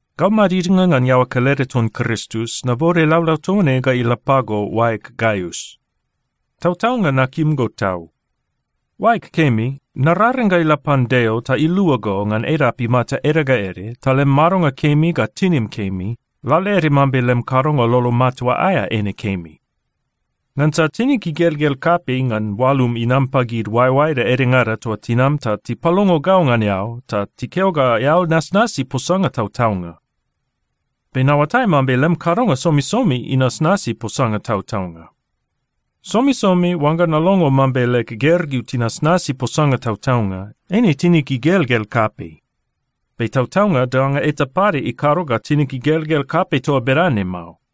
Gau madidnga ngan iaoa kelede ton Kristus, nabode laulau toa ne ga ila pago, oaeg Gaius. Tautaunga nakim go tau. Oaeg kemi, nararing ga ila pan Deo ta ilua go ngan edap imata ede ga ede ta lem madonga kemi ga tinim kemi, lalaede mambe lem kadonga lolo matua aea eine kemi. Ngansa tinig igelgel kapei ngan oalum inam pagid oaeoaeda edengada toa tinam ta tipalongo gau ngan eao ta tikeo ga eao nasnasi posanga tautaunga. Be naoatai mambe lem kadonga somisomi inasnasi posanga tautaunga. Somisomi oangga nalongo mambe leg gergeu tinasnasi posanga tautaunga, eine tinig igelgel kapei. Be tautaunga danga eta pade ikado ga tinig igelgel kapei toa bedane mao.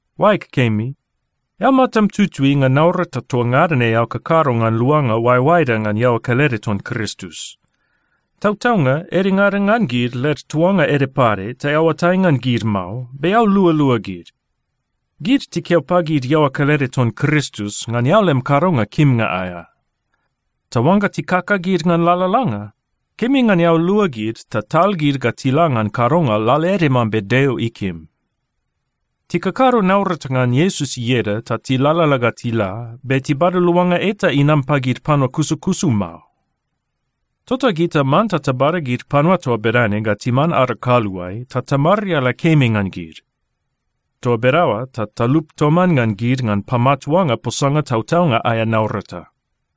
Oaeg kemi, eao matam tutui ngan naurata toa ngada ne eao kakado ngan luanga oaeoaeda ngan iaoa kelede ton Kristus. Tautaunga, edengada ngan gid, led tuanga ede pade ta eao oatai ngan gid mao, be eao lualua gid. Gid tikeo pagid iaoa kelede ton Kristus ngan eao lem kadonga kimnga aea. Ta oangga tikakagid ngan lalalanga, kemi ngan eao lua gid ta tal gid ga tila ngan kadonga lalaede mambe Deo ikim. Tikakado naurata ngan Iesus ieda ta tilalala ga tila, be tibada luanga eta inam pagid panua kusukusu mao. Tota gita manta tabada gid panua toa bedane ga timan ada kaluae ta tamariala kemi ngan gid. Toa bedaoa ta talup toman ngan gid ngan pamatuanga posanga tautaunga aea naurata.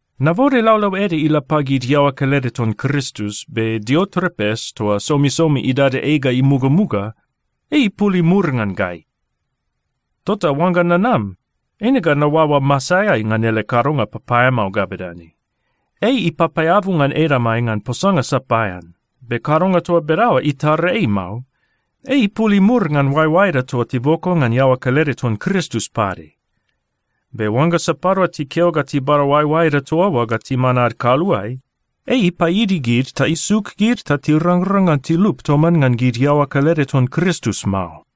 Nabode laulau ede ila pagid iaoa kelede ton Kristus, be Diotrepes toa somisomi idada ei ga imugamuga, ei ipul imur ngan gai. Tota oangga nanam, eine ga naoaoa masaeai ngan ele kadonga papaeamao ga bedane: Ei ipapaeabu ngan edamai ngan posanga sapaean. Be kadonga toa bedaoa itara ei mao. Ei ipul imur ngan oaeoaeda toa tiboko ngan iaoa kelede ton Kristus pade. Be oangga sapadua tikeo ga tibada oaeoaeda toa oa ga timan ad kaluae, ei ipaidi gid ta isuk gid ta tirangrang ngan tilup toman ngan gid iaoa kelede ton Kristus mao.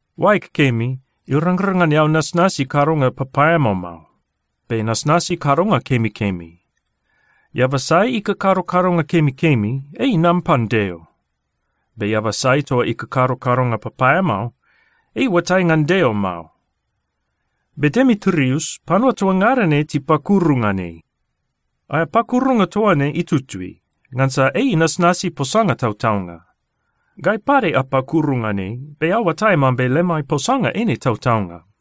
Oaeg kemi, irangrang ngan eao nasnasi kadonga papaeamao mao, be nasnasi kadonga kemikemi. Eaba sai ikakado kadonga kemikemi, ei inam pan Deo. Be eaba sai toa ikakado kadonga papaeamao, ei iuatai ngan Deo mao. Be Demitrius, panua toa ngada ne tipakuru ngan ei. Aea pakurunga toa ne itutui, ngansa ei inasnasi posanga tautaunga. Gai pade apakuru ngan ei, be eao oatai mambe lemai posanga eine tautaunga.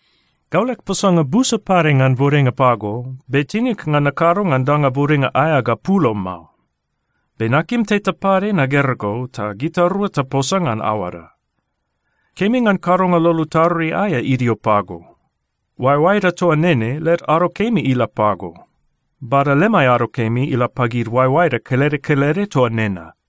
Gau leg posanga busa pade ngan bodenga pago, be tinig ngan nakado ngan danga bodenga aea ga pulo mao. Be nakim teta pade nagera go ta gitarua taposa ngan aoada. Kemi ngan kadonga lolo tarui aea idio pago. Oaeoaeda toa nene led ado kemi ila pago. Bada lemai ado kemi ila pagid oaeoaeda kelede kelede toa nena.